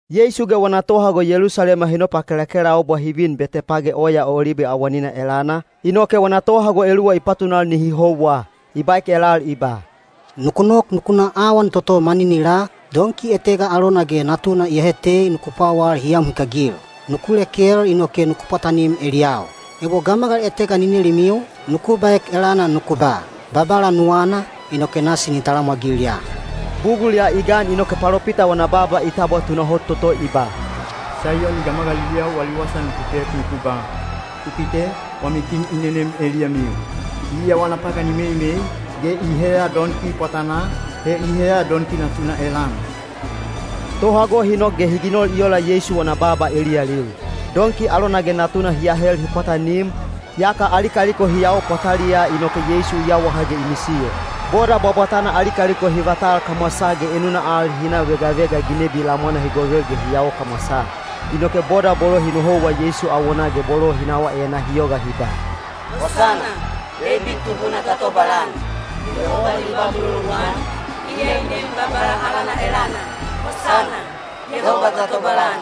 Yeisu ge wana tohago Yelusalema hi nopakelakelaubwa hi vin Betepage Oya Olibe awanina elana, inoke wana tohago eluwa i patunal nihi houwa. I baek elal i ba, “Nuku nok nuku na awan toto maninilaa, donki etega alona ge natuna iyahe tei nuku pwawal hi am hikagil. Nuku lekel inoke nuku pwatanim eliyau. Ebo gamagal etega ni nelimiu, nuku baek elana nuku ba, ‘Babala nuwana,’ inoke nasi ni talamwagil ya.” Bugul ya i gan inoke palopita wana baaba i tabwa tunahot toto i ba: Saiyoni gamagaliliyau wali wasa nuku pek nuku ba: Ku kite, wami kin i nenem eliyamiu. Iya wana pagan i meimei, ge i heya donki pwatanaa, he i heya donki natuna elana. Tohago hi nok ge hi ginol i ola Yeisu wana baaba eliyalil. Donki alona ge natuna hi ahel hi pwatanim, yaka ali kaliko hi yao pwataliyaa inoke Yeisu i yawaha ge i misiyo. Boda bwabwatana ali kaliko hi yao kamwasaa ge enuna al hi na vegavega ginebi lamwana hi govel ge hi yao kamwasaa. Inoke boda bolo hi nohouwa Yeisu awonaa ge bolo hi nawaa enaa hi yoga hi ba: Hosana! Deibid Tubuna ta tobalan! Yehoba ni ba muloluan, iya i nem Babala alana elana! Hosana! Yehoba ta tobalan!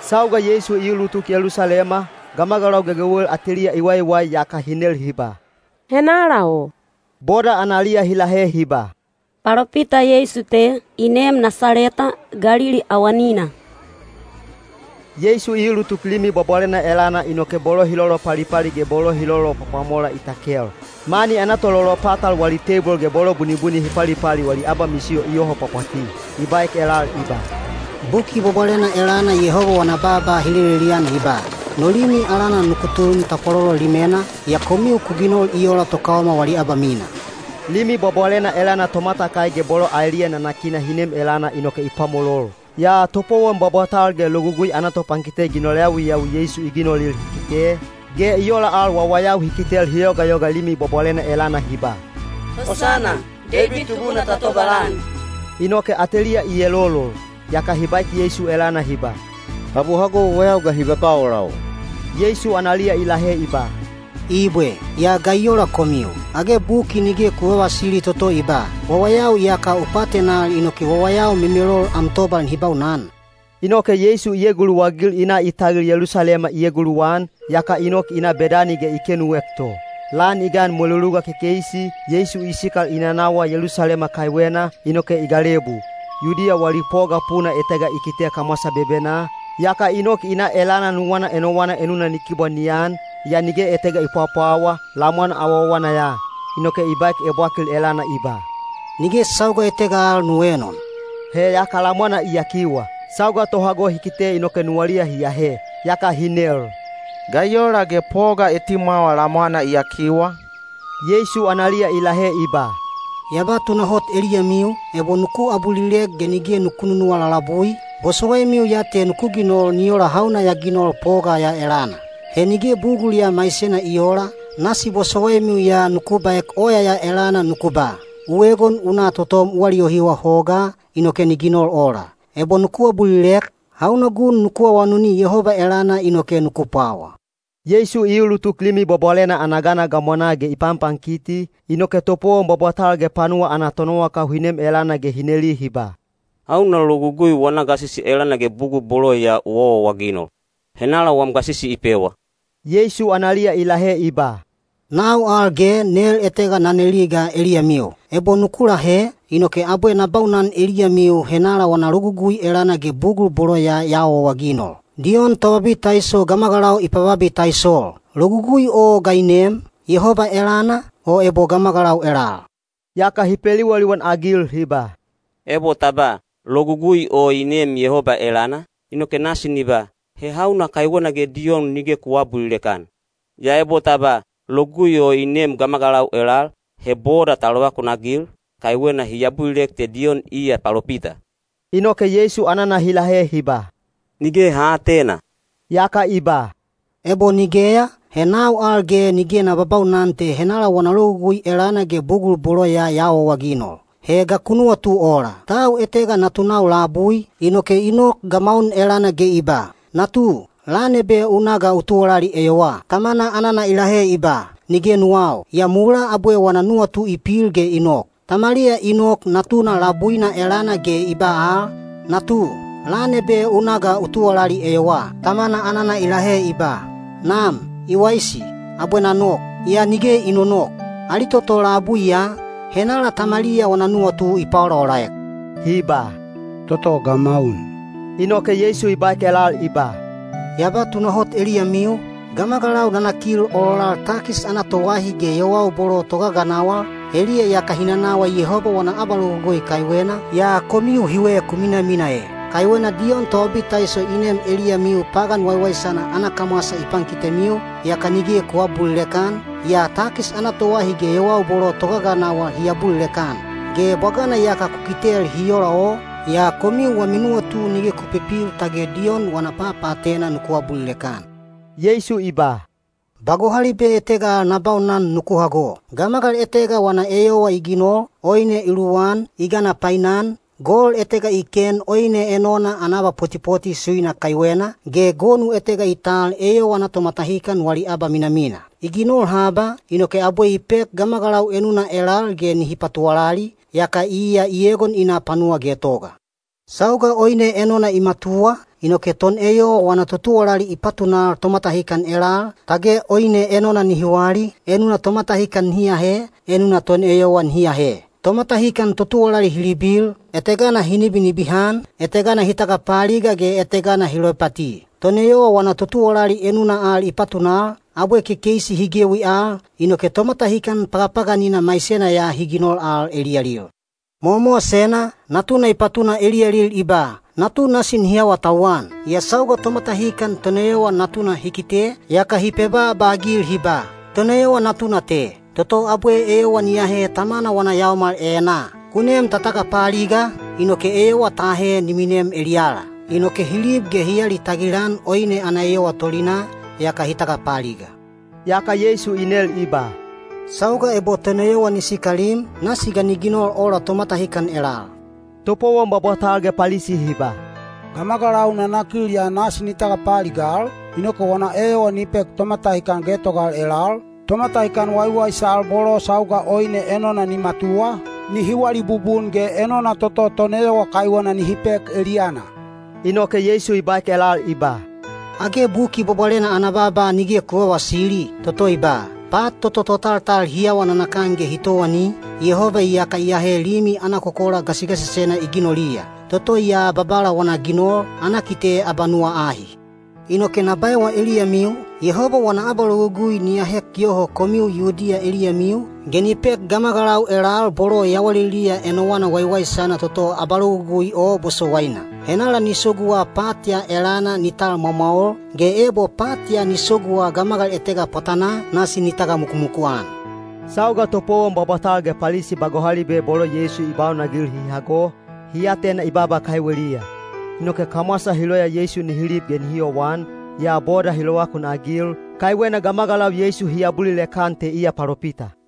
Sauga Yeisu i ulutuk Yelusalema, gamagalau gegewel ateliya i waiwai yaka hi nel hi ba, “Henala o?” Boda analiya hi lahe hi ba, “Palopita Yeisu te, i neem Nasaleta, Galili awanina.” Yeisu i ulutuk Limi Bwabwalena elana inoke bolo hi lolopalipali ge bolo hi lolopwapwamola i takel. Mani ana tololopatal wali teibol ge bolo bunibuni hi palipali wali abamisiyo i yoho pwapwati. I baek elal i ba, “Buki Bwabwalena elana Yehoba wana baaba hi lelelian i ba, ‘No limi alana nuku tun tapwalolo limena,’ yaa komiu ku ginol i ola tokaoma wali abamina.” Limi Bwabwalena elana tomatakai ge bolo aeliya nanakina hi nem elana inoke i pwamolol. Yaa topowon bwabwatal ge Logugui ana topankite ginol yawiyawi Yeisu i ginolil hi kite, ge i ola al wawayau hi kitel hi yogayoga Limi Bwabwalena elana hi ba, “Hosana! Deibid Tubuna ta tobalan,” inoke ateliya i elolol. Yaka hi baek Yeisu elana hi ba, “Tab u hago wawayau ga hi babaa ola o?” Yeisu analiya i lahe i ba, “Ibwe. Yaa ga i ola komiu? Age buki nige ku vavasili toto i ba, ‘Wawayau ge wawayau memelol iyaka u paatenal am tobal nihi baunan’?” Inoke Yeisu i eguluwagil i na i tagil Yelusalema i eguluwan, yaka i nok i na Bedani ge i kenuek to. Lan i gan mweluluga kekeisi, Yeisu i sikal i nanawa Yelusalema kaiwena, inoke i galebu. Yudiya wali poga puna etega i kite kamwasa bebenaa, yaka i nok i na elana nuwana enowana enuna ni kibwa ni an, yaa nige etega i pwapwawa, lamwana awawana ya. Inoke i baek ebwakil elana i ba, “Nige sauga etega al nu eenon.” He yaka lamwana i yakiwa. Sauga tohago hi kite inoke nuwaliya hi ahe. Yaka hi nel, “Ga i ola ge poga etimwawa lamwana i yakiwa?” Yeisu analiya i lahe i ba, “Ya ba tunahot eliyamiu, ebo nuku abulilek ge nige nuku nunuwa lalabui, bosowaimiu ya te nuku ginol ni ola hauna ya ginol poga ya elana. He nige bugul ya maisena i oola, nasi bosowaimiu ya nuku baek oya ya elana nuku ba, ‘U egon u na totom u aliyohiwa hogaa,’ inoke ni ginol ola. Ebo nuku abulilek, hauna gun nuku awanuni Yehoba elana inoke nuku pwawa.” Yeisu i ulutuk Limi Bwabwalena ana gana gamwanaa ge i panpankiti, inoke topowon bwabwatal ge panuwa ana tonowakau hi nem elana ge hi neli hi ba, “Hauna logugui wana gasisi elana ge bugul bolo ya u awaawaginol? Henala wam gasisi i pewa?” Yeisu analiya i lahe i ba, “Nau al ge nel etega na neli ga eliyamiu. Ebo nuku lahe, inoke abwe na baunan eliyamiu henala wana logugui elana ge bugul bolo ya ya awaawaginol. Diyon Tobabitaiso gamagalau i pababitaisol. Logugui o ga i neem? Yehoba elana, o ebo gamagalau elal?” Yaka hi peliwaliwan-agil hi ba, “Ebo ta ba, ‘Logugui o i neem Yehoba elana,’ inoke nasi ni ba, ‘He hauna kaiwena ge Diyon nige ku aabulilek-an?’ Yaa ebo ta ba, ‘Logugui o i neem gamagalau elal,’ he boda ta lovakunagil, kaiwena hi abulilek te Diyon iya palopita.” Inoke Yeisu anana hi lahe hi ba, “Nige ha aatena.” Yaka i ba, “Ebo nigeya, he nau al ge nige na babaunan te henala wana logugui elana ge bugul bolo ya ya awaawaginol.” “He ga ku nuwatu ola? Tau etega natunau bolau labui, inoke i nok gamaun elana ge i ba, ‘Natu, lan ebe u na ga u tuwalali eyowaa.’ Tamana anana i lahe i ba, ‘Nige nuwau,’ yaa mulaa abwe wana nuwatu i pil ge i nok. Tamaliya i nok natuna labuina elana ge i ba al, ‘Natu, lan ebe u na ga u tuwalali eyowaa.’ Tamana anana i lahe i ba, ‘Nam, i waisi, abwe na nok,’ yaa nige i nonok. Ali toto labui ya, henala tamaliya wana nuwatu i paolaolaek?” Hi ba, “Toto gamaun.” Inoke Yeisu i baek elal i ba, “Ya ba tunahot eliyamiu, gamagalau nanakil ololal takis ana toahi ge yowau bolo togaganawal, heliya iyaka hi nanawa Yehoba wana abalogugui kaiwena, yaa komiu hiwe ku minamina ee. Kaiwena Diyon Tobabitaiso i nem eliyamiu pagan waiwaisana ana kamwasa i pankitemiu, yaka nige ku aabulilek-an, yaa takis ana toahi ge yowau bolo togaganawal hi abulilek-an. Ge bwagana iyaka ku kitel hi ola o, yaa komiu wami nuwatu nige ku pipil tage Diyon wana papaatena nuku abulilek-an.” Yeisu i ba, “Ba gohalibe etega al na baunan nuku hago. Gamagal etega wana eyowa i ginol, oine i luwan, i gana painan, gol etega i ken oine enona ana abapotipoti suina kaiwena, ge gonu etega i tal eyowa ana tomatahikan wali abaminamina. I ginol haba, inoke abwe i pek gamagalau enuna elal ge nihi patuwalali, yaka iya i egon i na panuwa getoga. “Sauga oine enona i matuwa, inoke toneyowa wana totuwalali i patunal tomatahikan elal, tage oine enona nihi wali, enuna tomatahikan nihi ahe, enuna toneyowa ni ahe. Tomatahikan totuwalali hi libil; etegana hi nibinibihan, etegana hi tagapaaliga ge etegana hi loipati. Toneyowa wana totuwalali enuna al i patunal, abwe kekeisi hi gewi al, inoke tomatahikan pagapaganina maisena ya hi ginol al eliyalil. Mowamowasena, natuna i patuna eliyalil i ba, ‘Natu nasi nihi awatauwan.’ “Yaa sauga tomatahikan toneyowa natuna hi kite, yaka hi pebaaba-agil hi ba, ‘Toneyowa natuna te, toto abwe eyowa ni ahe tamana wana yaomal enaa. Ku nem ta tagapaaliga, inoke eyowa ta ahe ni minem eliyala.’ Inoke hi lib ge hi alitagil-an oine ana eyowa tolinaa, yaka hi tagapaaliga.” Yaka Yeisu i nel i ba, “Sauga ebo toneyowa ni sikalim, nasi ga ni ginol ola tomatahikan elal?” Topowon bwabwatal ge Palisi hi ba, “Gamagalau nanakil ya nasi ni tagapaaligal, inoke wana eyowa ni pek tomatahikan getogal elal, tomatahikan waiwaisal bolo sauga oine enona ni matuwa, nihi wali bubun ge enona toto toneyowa kaiwena nihi pek eliyana.” Inoke Yeisu i baek elal i ba, “Age Buki Bwabwalena ana baaba nige ku vavasili, toto i ba, ‘Pat toto totaltal hi awa nanakan ge hi towani, Yehoba iyaka i ahe limi ana kokola gasigasisena i ginoliya. Toto ya Babala wana ginol, ana kite abanuwa ahi.’ “Inoke na baewa eliyamiu, Yehoba wana abalogugui ni ahek yoho komiu Yudiya eliyamiu, ge ni pek gamagalau elal bolo yawaliliya enowana waiwaisana toto abalogugui o bosowaina. Henala ni soguwa pat ya elana ni tal mwamwaol, ge ebo pat ya ni soguwa gamagal etega pwatanaa, nasi ni tagamukumuku-an.” Sauga topowon bwabwatal ge Palisi ba gohalibe bolo Yeisu i baunagil hi hago, hi atena i baaba kaiweliya. Inoke kamwasa hi loya Yeisu nihi lib ge nihi yowan, yaa boda hi lovakunagil, kaiwena gamagalau Yeisu hi abulilek-an te iya palopita.